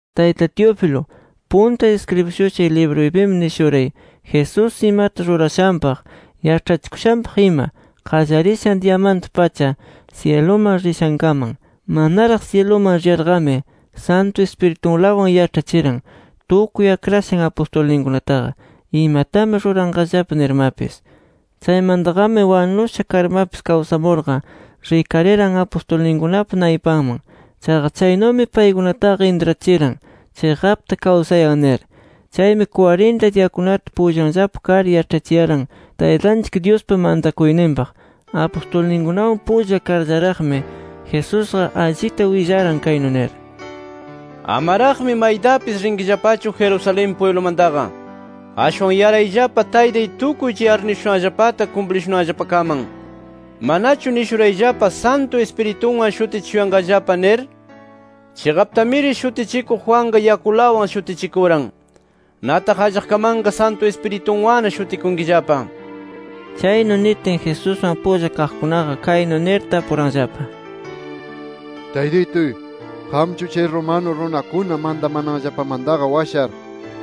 Tayta Teófilo, punta iskribishushay libruypimi nishuray Jesús imata rurashanpaq, yaĉhachikushanpaq ima, qallarishan diyamanta-pacha, syiluman rishankaman. Manaraq syiluman riyarqami, Santu Ispiritunlawan yaĉhachiran, tukuy akrashan apustulninkunataqa, imatami ruranqallapa nirmapis. Chaymantaqami, wanusha karmapis kawsamurqa rikariran apustulninkunapa naypanman. Chaqa, chaynumi paykunataqa intrachiran “Chiqapta kawsayan” nir. Chaymi, kwarinta diyakunata pullanllapa kar, yaĉhachiyaran Taytanchik Dyuspa mantakuyninpaq. Apustulninkunawan pulla karllaraqmi, Jesusqa allita willaran, kaynu nir: —Amaraqmi maytapis rinkillapachu Jerusalén pwiblumantaqa. Ashwan yarayllapa Taytay tukuy chay arnishushanllapata kumplishunanllapakaman. Manachu nishurayllapa Santu Ispiritunwan shutichishuyanqallapa nir. Chiqaptamiri Shutichikuq Juanqa yakulawan shutichikuran. Nataq allaqkamanqa Santu Ispirituwanna shutikunkillapa. Chaynu nitin Jesuswan pulla kaqkunaqa kaynu nir, tapuranllapa: —Taytituy, ¿qamchu, chay romano runakuna mantamananllapamantaqa washar,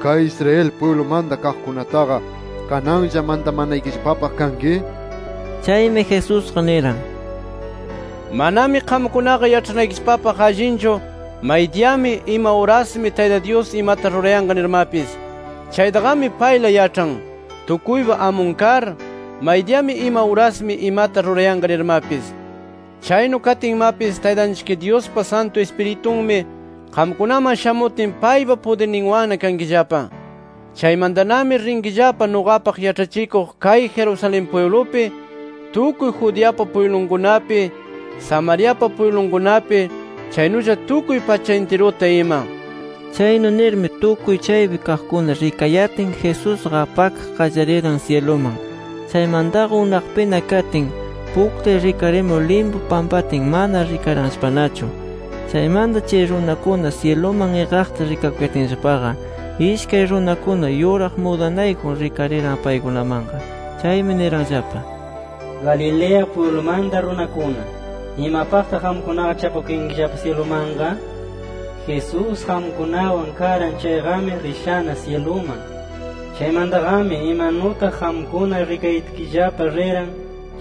kay Israel pwiblumanta kaqkunataqa kananlla mantamanaykillapapaq kanki? nir. Chaymi Jesusqa niran: —Manami qamkunaqa yaĉhanaykillapapaq allinchu, maydiyami, ima urasmi Tayta Dyus imata rurayanqa nirmapis. Chaytaqami payla yaĉhan, tukuypa amun kar, maydiyami, ima urasmi imata rurayanqa nirmapis. Chaynu katinmapis, Taytanchik Dyuspa Santu Ispiritunmi qamkunaman shamutin, paypa pudirninwanna kankillapa. Chaymantanami rinkillapa nuqapaq yaĉhachikuq kay Jerusalén pwiblupi, tukuy Judeapa pwiblunkunapi, Samariapa pwiblunkunapi, chaynulla tukuy pacha intiruta ima. Chaynu nirmi, tukuy chaypi kaqkuna rikayatin, Jesusqa apakaq qallariran syiluman. Chaymantaqa unaqpina katin, puktay rikarimur limpu pampatin, mana rikaranllapanachu. Chaymanta chay runakuna, syiluman iqaqta rikakuyatinllapaqa, ishkay runakuna yuraq mudanayjun rikariran paykunamanqa. Chaymi niranllapa: —Galilea pwiblumanta runakuna, ¿imapaqtaq qamkunaqa chapakuyankillapa syilumanqa? Jesús, qamkunawan karan chayqami rishana syiluman. Chaymantaqami imanutaq qamkuna rikayatkillapa riran,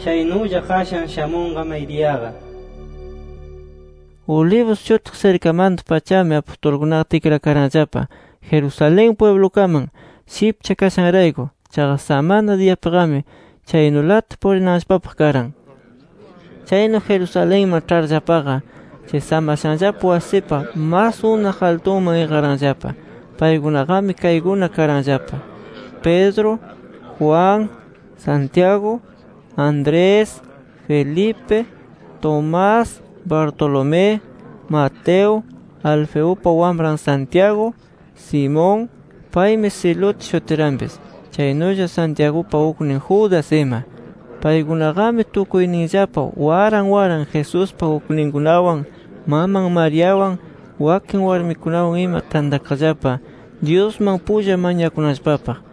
chaynulla qashan shamunqa maydiyaqa. Olivos shutiq sirkamanta-pachami apustulkunaqa tikrakaranllapa Jerusalén pwiblukaman, shipcha kashanrayku. Chaqa samana diyapiqami chaynulata purinanllapapaq karan. Chaynu Jerusalenman ĉharllapaqa, chay samashanllapa wasipa mas unaq altuman iqaranllapa. Paykunaqami kaykuna karanllapa: Pedro, Juan, Santiago, Andrés, Felipe, Tomás, Bartolomé, Mateo, Alfeupa wamran Santiago, Simón (paymi Celote shutiranpis), chaynulla Santiagupa uknin Judas ima. Paykunaqami tukuyninllapa waran waran Jesuspa ukninkunawan, maman Mariawan, wakin warmikunawan ima tantakaqllapa Dyusman pulla mañakunanllapapaq.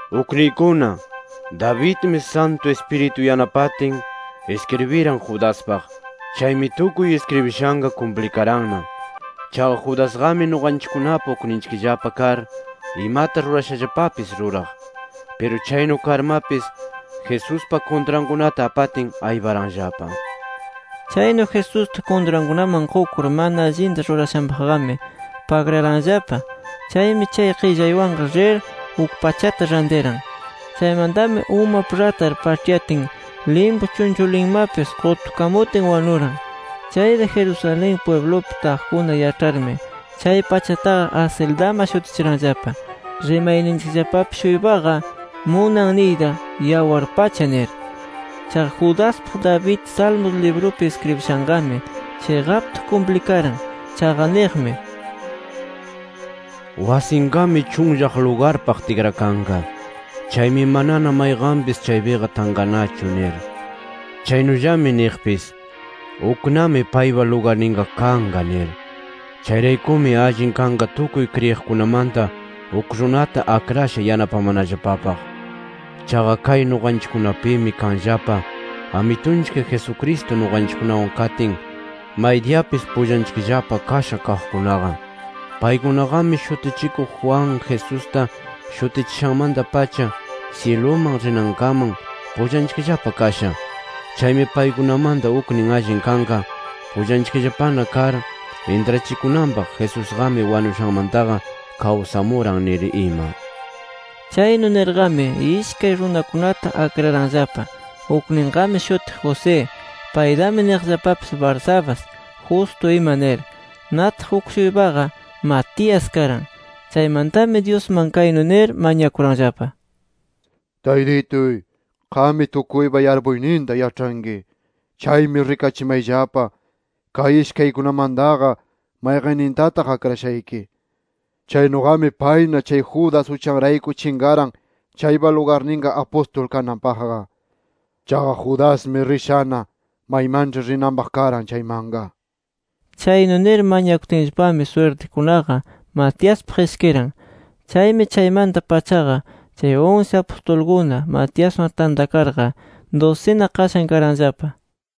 “Ukniykuna, Davidmi Santu Ispiritu yanapatin iskribiran Judaspaq. Chaymi tukuy iskribishanqa kumplikaranna. Chaqa Judasqami nuqanchikkunapa ukninchikllapa kar, imata rurashallapapis ruraq. Piru chaynu karmapis Jesuspa kuntrankunata apatin, ayparanllapa. Chaynu Jesusta kuntrankunaman qukur mana allinta rurashanpaqqami pagraranllapa. Chaymi chay qillaywanqa rir uk pachata rantiran. Chaymantami umap ratar paĉhyatin, limpu chunchulinmapis qutukamutin wanuran. Chayta Jerusalén pwiblupi taqkuna yaĉharmi, chay pachataqa ‘Acéldama’ shutichiranllapa. Rimayninllapapi-shuypaqa munan niyta ‘Yawar Pacha’ nir. Chaqa Judaspaq David, Salmos librupi iskribishanqami chiqapta kumplikaran. Chaqa niqmi: ‘Wasinqami chunllaq lugarpaq tikrakanqa. Chaymi manana mayqanpis chaypiqa tanqanachu’ nir. Chaynullami niqpis: ‘Uknami paypa lugarninqa kanqa’ nir. “Chayraykumi, allin kanqa tukuy kriyiqkunamanta, uk runata akrasha yanapamanallapapaq. Chaqa kay nuqanchikkunapimi kanllapa Amitunchik Jesucristo nuqanchikkunawan katin, maydiyapis pullanchikllapa kasha kaqkunaqa. Paykunaqami Shutichikuq Juan, Jesusta shutichishanmanta-pacha, syiluman rinankaman, pullanchikllapa kasha. Chaymi paykunamanta uknin allin kanqa, pullanchikllapana kar intrachikunanpaq, Jesusqami wanushanmantaqa kawsamuran nir ima”. Chaynu nirqami ishkay runakunata akraranllapa: Ukninqami shutiq José. Paytami niqllapapis: Barsabás, Justo ima nir. Nataq, uk-shuypaqa Matías karan. Chaymantami Dyusman kaynu nir mañakuranllapa: “Taytituy, qammi tukuypa yarpuyninta yaĉhanki. Chaymi rikachimayllapa, kay ishkaykunamantaqa mayqannintataq akrashayki. Chaynuqami payna chay Judas uchanrayku chinqaran chaypa lugarninqa apustul kananpaqqa. Chaqa Judasqami rishana maymanĉhi rinanpaq karan chaymanqa” nir. Chaynu nir mañakutinllapami swirtikunaqa Matiaspaq ishkiran. Chaymi chaymanta-pachaqa chay unsi apustulkuna, Matiaswan tantakarqa dusina qashan karanllapa.